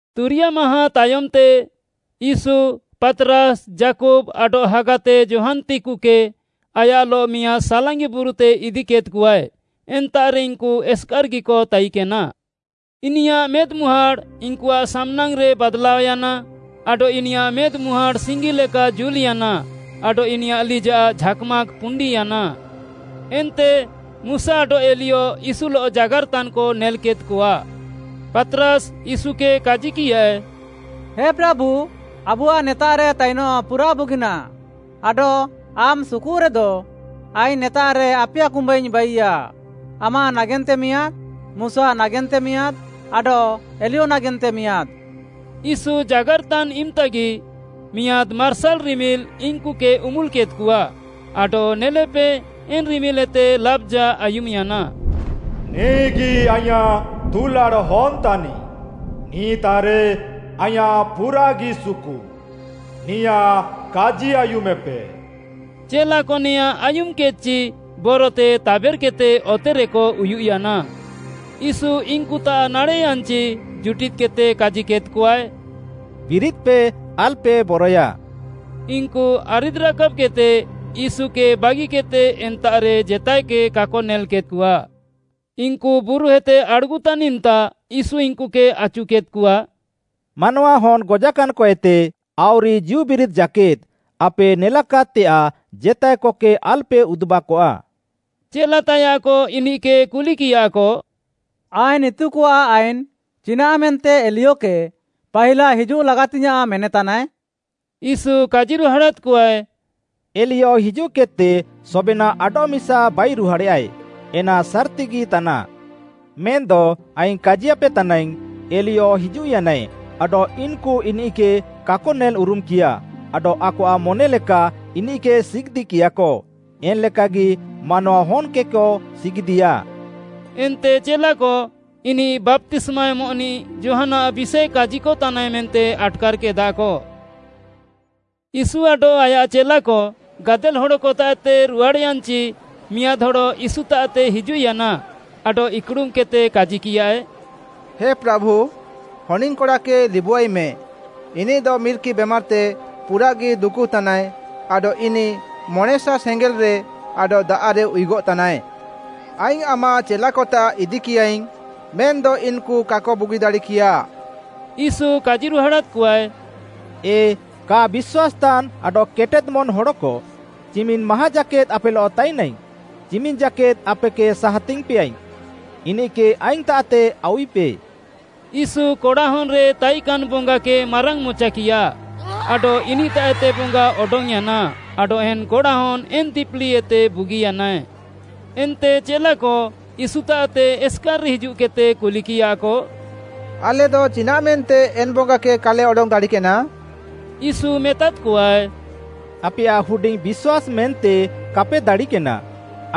ତୁରିୟା ମାହାଁ ତାୟମ୍‌ତେ ୟୀଶୁ, ପାତ୍‌ରାସ୍‌, ଯାକୁବ୍‌ ଆଡଃ ହାଗାତେ ଯୋହାନ୍‌ତେକୁକେ ଆୟାଃଲଃ ମିଆଁଦ୍‌ ସାଲାଙ୍ଗି ବୁରୁତେ ଇଦିକେଦ୍‌କଆଏ। ଏନ୍ତାଃରେ ଇନ୍‌କୁ ଏସ୍‌କାର୍‌ଗିକ ତାଇକେନା। ଇନିୟାଃ ମେଦ୍‌ମୁହାଁଡ଼୍‌ ଇନ୍‌କୁଆଃ ସାମ୍‌ନାଙ୍ଗ୍‌ରେ ବାଦ୍‌ଲାୟାନା ଆଡଃ ଇନିୟାଃ ମେଦ୍‌ମୁହାଁଡ଼୍‌ ସିଙ୍ଗିଲେକା ଜୁଲ୍‌ୟାନା ଆଡଃ ଇନିୟାଃ ଲିଜାଃ ଝାକ୍‌ ମାକ୍‌ ପୁଣ୍ଡିୟାନା। ଏନ୍ତେ ମୁଶା ଆଡଃ ଏଲିୟ ୟୀଶୁଲଃ ଜାଗାର୍‍ତାନ୍‌କ ନେଲ୍‌କେଦ୍‌କଆ। ପାତ୍‌ରାସ୍‌ ୟୀଶୁକେ କାଜିକିୟାଏ, “ହେ ପ୍ରାଭୁ, ଆବୁଆଃ ନେତାଃରେ ତାଇନଃ ପୁରାଃ ବୁଗିନାଃ, ଆଡଃ ଆମ୍‌ ସୁକୁରେଦ, ଆଇଙ୍ଗ୍‌ ନେତାଃରେ ଆପିୟା କୁମ୍ବାଇଙ୍ଗ୍‌ ବାଇୟା, ଆମାଃ ନାଗେନ୍ତେ ମିଆଁଦ୍‌, ମୁଶା ନାଗେନ୍ତେ ମିଆଁଦ୍‌ ଆଡଃ ଏଲିୟ ନାଗେନ୍ତେ ମିଆଁଦ୍‌।” ୟୀଶୁ ଜାଗାର୍‌ତାନ୍‌ ଇମ୍‌ତାଗି ମିଆଁଦ୍‌ ମାର୍ସାଲ୍‌ ରିମିଲ୍‌ ଇନ୍‌କୁକେ ଉମ୍ବୁଲ୍‌କେଦ୍‍କଆ ଆଡଃ ନେଲେପେ, ଏନ୍‌ ରିମିଲ୍‌ଏତେ ଲାବ୍‌ଜା ଆୟୁମ୍‌ୟାନା, “ନିଃଗି ଆଇଁୟାଃ ଦୁଲାଡ଼୍‌ ହନ୍‌ ତାନିଃ, ନିଃତାଃରେ ଆଇଁୟାଃ ପୁରାଃଗି ସୁକୁ, ନିୟାଃ କାଜି ଆୟୁମେପେ।” ଚେଲାକ ନେଆଁଁ ଆୟୁମ୍‌କେଦ୍‌ଚି, ବରତେ ତାବେର୍‌କେଦ୍‍ତେ ଅତେରେକ ଉୟୁଃୟାନା। ୟୀଶୁ ଇନ୍‌କୁତାଃ ନାଡ଼େଃୟାନ୍‌ଚି ଜୁଟିଦ୍‌କେଦ୍‌ତେ କାଜିକେଦ୍‍କଆଏ, “ବିରିଦ୍‌ପେ, ଆଲ୍‌ପେ ବରଏୟା।” ଇନ୍‌କୁ ଆରିଦ୍‌ରାକାବ୍‌କେଦ୍‌ତେ ୟୀଶୁକେ ବାଗିକେଦ୍‌ତେ ଏନ୍ତାଃରେ ଜେତାଏକେ କାକ ନେଲ୍‌କେଦ୍‌କଆ। ଇନ୍‌କୁ ବୁରୁଏତେ ଆଡ଼୍‌ଗୁତାନ୍ ଇମ୍‌ତା ୟୀଶୁ ଇନ୍‌କୁକେ ଆଚୁକେଦ୍‌କଆ, “ମାନୱାହନ୍‌ ଗଜାକାନ୍‌କଏତେ ଆଉରି ଜୀଉବିରିଦ୍‌ ଜାକେଦ୍‌ ଆପେ ନେଲାକାଦ୍‌ତେୟାଃ ଜେତାଏକକେ ଆଲ୍‌ପେ ଉଦୁବାକଆ।” ଚେଲାତାୟାଃକ ଇନିଃକେ କୁଲିକିୟାକ, “ଆଇନ୍‌ ଇତୁକଆଃ ଆଇନ୍‌ ଚିନାଃ ମେନ୍ତେ ଏଲିୟକେ ପାହିଲା ହିଜୁଃ ଲାଗାତିଙ୍ଗ୍‌ୟାଁଃ ମେନେତାନାଏ?” ୟୀଶୁ କାଜିରୁହାଡ଼ାଦ୍‍କଆଏ, “ଏଲିୟ ହିଜୁଃକେଦ୍‌ତେ ସବେନାଃ ଆଡଃମିସା ବାଇରୁହାଡ଼େୟାଏ, ଏନା ସାର୍‌ତିଗି ତାନାଃ। ମେନ୍‌ଦ ଆଇଙ୍ଗ୍‌ କାଜିୟାପେ ତାନାଇଙ୍ଗ୍‌, ଏଲିୟ ହିଜୁଃୟାନାଏ ଆଡଃ ଇନ୍‌କୁ ଇନିଃକେ କାକ ନେଲ୍‌ଉରୁମ୍‌କିୟା ଆଡଃ ଆକଆଃ ମନେଲେକା ଇନିଃକେ ସିଗିଦ୍‌‌କିୟାକ। ଏନ୍‌ ଲେକାଗି ମାନୱାହନ୍‌କେକ ସିଗିଦିଆ।” ଏନ୍ତେ ଚେଲାକ, ଇନିଃ ବାପ୍ତିସ୍ମା ଏମଃନିଃ ଯୋହାନ୍‌ଆଃ ବିଷାଏ କାଜିକତାନାଏ ମେନ୍ତେ ଆଟ୍‌କାର୍‌କେଦାକ। ୟୀଶୁ ଆଡଃ ଆୟାଃ ଚେଲାକ ଗାଦେଲ୍‌ ହଡ଼କତାଃତେ ରୁହାଡ଼୍‌ୟାନ୍‌ଚି ମିଆଁଦ୍‌ ହଡ଼ ୟୀଶୁତାଃତେ ହିଜୁଃୟାନା ଆଡଃ ଇକ୍‌ଡ଼ୁମ୍‌କେଦ୍‌ତେ, କାଜିକିୟାଏ, “ହେ ପ୍ରାଭୁ, ହନିଙ୍ଗ୍‌କଡ଼ାକେ ଲିବୁଆଇମେ, ଇନିଃଦ ମିର୍କି ବେମାର୍‌ତେ ପୁରାଃଗି ଦୁକୁତାନାଏ ଆଡଃ ଇନିଃ ମଣେଁସା ସେଙ୍ଗେଲ୍‌ରେ ଆଡଃ ଦାଆଃରେ ଉୟୁଗଃତାନାଏ। ଆଇଙ୍ଗ୍‌ ଆମାଃ ଚେଲାକତାଃ ଇଦିକିୟାଇଙ୍ଗ୍‌ ମେନ୍‌ଦ ଇନ୍‌କୁ କାକ ବୁଗିଦାଡ଼ିକିୟା।” ୟୀଶୁ କାଜିରୁହାଡ଼ାଦ୍‌କଆଏ, “ଏ କା ବିଶ୍ୱାସ୍‌ତାନ୍‌ ଆଡଃ କେଟେଦ୍‌ ମନ୍‌ ହଡ଼କ, ଚିମିନ୍‌ ମାହାଁ ଜାକେଦ୍‌ ଆପେଲଃ ତାଇନାଇଙ୍ଗ୍‌? ଚିମିନ୍‌ ଜାକେଦ୍‌ ଆପେକେ ସାହାତିଙ୍ଗ୍‌ପେଆଇଙ୍ଗ୍‌, ଇନିଃକେ ଆଇଙ୍ଗ୍‌ତାଃତେ ଆଉୱିପେ।” ୟୀଶୁ କଡ଼ାହନ୍‌ରେ ତାଇକାନ୍‌ ବଙ୍ଗାକେ ମାରାଙ୍ଗ୍‌ମଚାକିୟା ଆଡଃ ଇନିଃତାଃଏତେ ବଙ୍ଗା ଅଡଙ୍ଗ୍‌ୟାନା ଆଡଃ ଏନ୍‌ କଡ଼ାହନ୍‌ ଏନ୍‌ ଦିପିଲିଏତେ ବୁଗିୟାନାଏ। ଏନ୍ତେ ଚେଲାକ ୟୀଶୁତାଃତେ ଏସ୍‌କାର୍‌ରେ ହିଜୁଃକେଦ୍‌ତେ କୁଲିକିୟାକ, “ଆଲେଦ ଚିନାଃମେନ୍ତେ ଏନ୍‌ ବଙ୍ଗାକେ କାଲେ ଅଡଙ୍ଗ୍‌ ଦାଡ଼ିକେନା?” ୟୀଶୁ ମେତାଦ୍‌କଆଏ, “ଆପେୟାଃ ହୁଡିଙ୍ଗ୍‌ ବିଶ୍ୱାସ୍‌ ମେନ୍ତେ କାପେ ଦାଡ଼ିକେନା।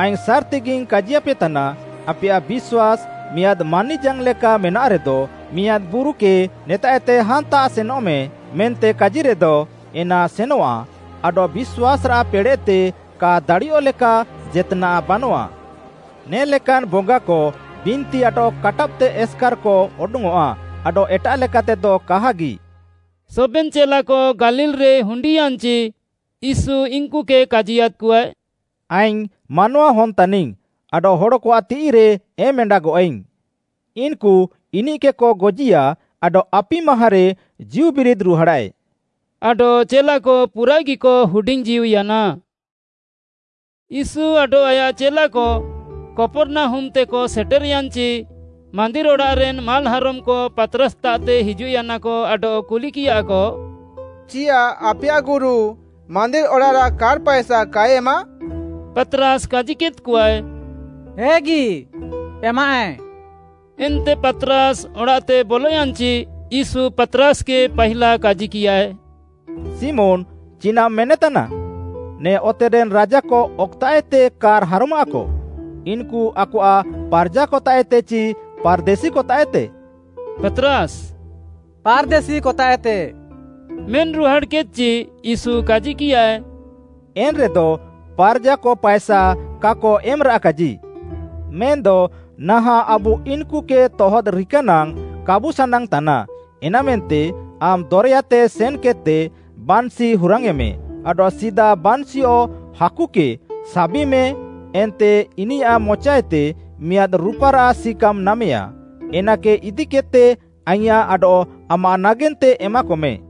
ଆଇଙ୍ଗ୍‌ ସାର୍‌ତିଗିଙ୍ଗ୍‌ କାଜିୟାପେତାନା, ଆପେୟାଃ ବିଶ୍ୱାସ୍‌ ମିଆଁଦ୍‌ ମାନିଜାଙ୍ଗ୍‌ଲେକା ମେନାଃରେଦ, ମିଆଁଦ୍‌ ବୁରୁକେ ନେତାଃଏତେ ହାନ୍ତାଃତେ ସେନଃମେ ମେନ୍ତେ କାଜିରେଦ ଏନା ସେନଃଆ ଆଡଃ ବିଶ୍ୱାସ୍‌ରାଃ ପେଡ଼େଃତେ କା ଦାଡ଼ିୟଃଲେକା ଜେତ୍‌ନାଃ ବାନଆଃ। ନେ ଲେକାନ୍‌ ବଙ୍ଗାକ ବିନ୍ତି ଆଡଃ କାଟାବ୍‌କେଦ୍‌ତେ ଏସ୍‌କାର୍‌କ ଅଡଙ୍ଗ୍‌ଅଃଆ ଆଡଃ ଏଟାଃ ଲେକାତେଦ କାହାଗି।” ସବେନ୍‌ ଚେଲାକ ଗାଲିଲ୍‌ରେ ହୁଣ୍ଡିୟାନ୍‌ଚି ୟୀଶୁ ଇନ୍‌କୁକେ କାଜିୟାଦ୍‌କଆଏ, “ଆଇଙ୍ଗ୍‌ ମାନୱାହନ୍‌ ତାନିଙ୍ଗ୍‌, ଆଡଃ ହଡ଼କଆଃ ତିଃଇରେ ଏମ୍‌ଏଣ୍ଡାଗଃଆଇଙ୍ଗ୍‌। ଇନ୍‌କୁ ଇନିଃକେକ ଗଜିୟା ଆଡଃ ଆପି ମାହାଁରେ ଜୀଉବିରିଦ୍‌ ରୁହାଡ଼ାଏ।” ଆଡଃ ଚେଲାକ ପୁରାଃଗିକ ହୁଡିଙ୍ଗ୍‌ଜୀଉୟାନା। ୟୀଶୁ ଆଡଃ ଆୟାଃ ଚେଲାକ କପର୍‌ନାହୁମ୍‌ତେକ ସେଟେର୍‌ୟାନ୍‌ଚି, ମାନ୍ଦିର୍‌ ଅଡ଼ାଃରେନ୍‌ ମାଲ୍‌ହାରମ୍‌କ ପାତ୍‌ରାସ୍‌ତାଃତେ ହିଜୁଃୟାନାକ ଆଡଃ କୁଲିକିୟାକ, “ଚିୟାଃ ଆପେୟାଃ ଗୁରୁ ମାନ୍ଦିର୍‌ ଅଡ଼ାଃରାଃ କାର୍‍ ପାଏସା କାଏ ଏମାଃ?” ପାତ୍‌ରାସ୍‌ କାଜିକେଦ୍‌କଆଏ, “ହେଗି, ଏମାଃଏ।” ଏନ୍ତେ ପାତ୍‌ରାସ୍‌ ଅଡ଼ାଃତେ ବଲୟାନ୍‌ଚି, ୟୀଶୁ ପାତ୍‌ରାସ୍‌କେ ପାହିଲା କାଜିକିୟାଏ, “ଶିମୋନ୍‌ ଚିନାଃମ୍‌ ମେନେତାନା? ନେ ଅତେରେନ୍‌ ରାଜାକ ଅକଏତାଃଏତେ କାର୍‌ ହାରମାଃକ? ଇନ୍‌କୁ ଆକଆଃ ପାର୍‌ଜାକତାଃଏତେ ଚି ପାର୍‌ଦେଶିକତାଃଏତେ?” ପାତ୍‌ରାସ୍‌, “ପାର୍‌ଦେଶିକତାଃଏତେ” ମେନ୍‍ରୁହାଡ଼୍‌କେଦ୍‌ଚି, ୟୀଶୁ କାଜିକିୟାଏ, “ଏନ୍‌ରେଦ ପାର୍‌ଜାକ ପାଏସା କାକ ଏମ୍‌ରାଃକାଜି। ମେନ୍‌ଦ ନାହାଁଃ ଆବୁ ଇନ୍‌କୁକେ ତହଦ୍‌ରିକା ନାଙ୍ଗ୍‌ କାବୁ ସାନାଙ୍ଗ୍‌ ତାନା, ଏନା ମେନ୍ତେ ଆମ୍‌ ଦରେୟାତେ ସେନ୍‌କେଦ୍‌ତେ ବାନ୍‍ଶି ହୁରାଙ୍ଗ୍‌ୟେଁମେ ଆଡଃ ସିଦା ବାନ୍‌ଶିଅଃ ହାକୁକେ ସାବିମେ ଏନ୍ତେ ଇନିୟାଃ ମଚାଏତେ ମିଆଁଦ୍‌ ରୁପାରାଃ ସିକାମ୍‌ ନାମେୟା, ଏନାକେ ଇଦିକେଦ୍‌ତେ ଆଇଁୟାଃ ଆଡଃ ଆମାଃ ନାଗେନ୍ତେ ଏମାକମେ।”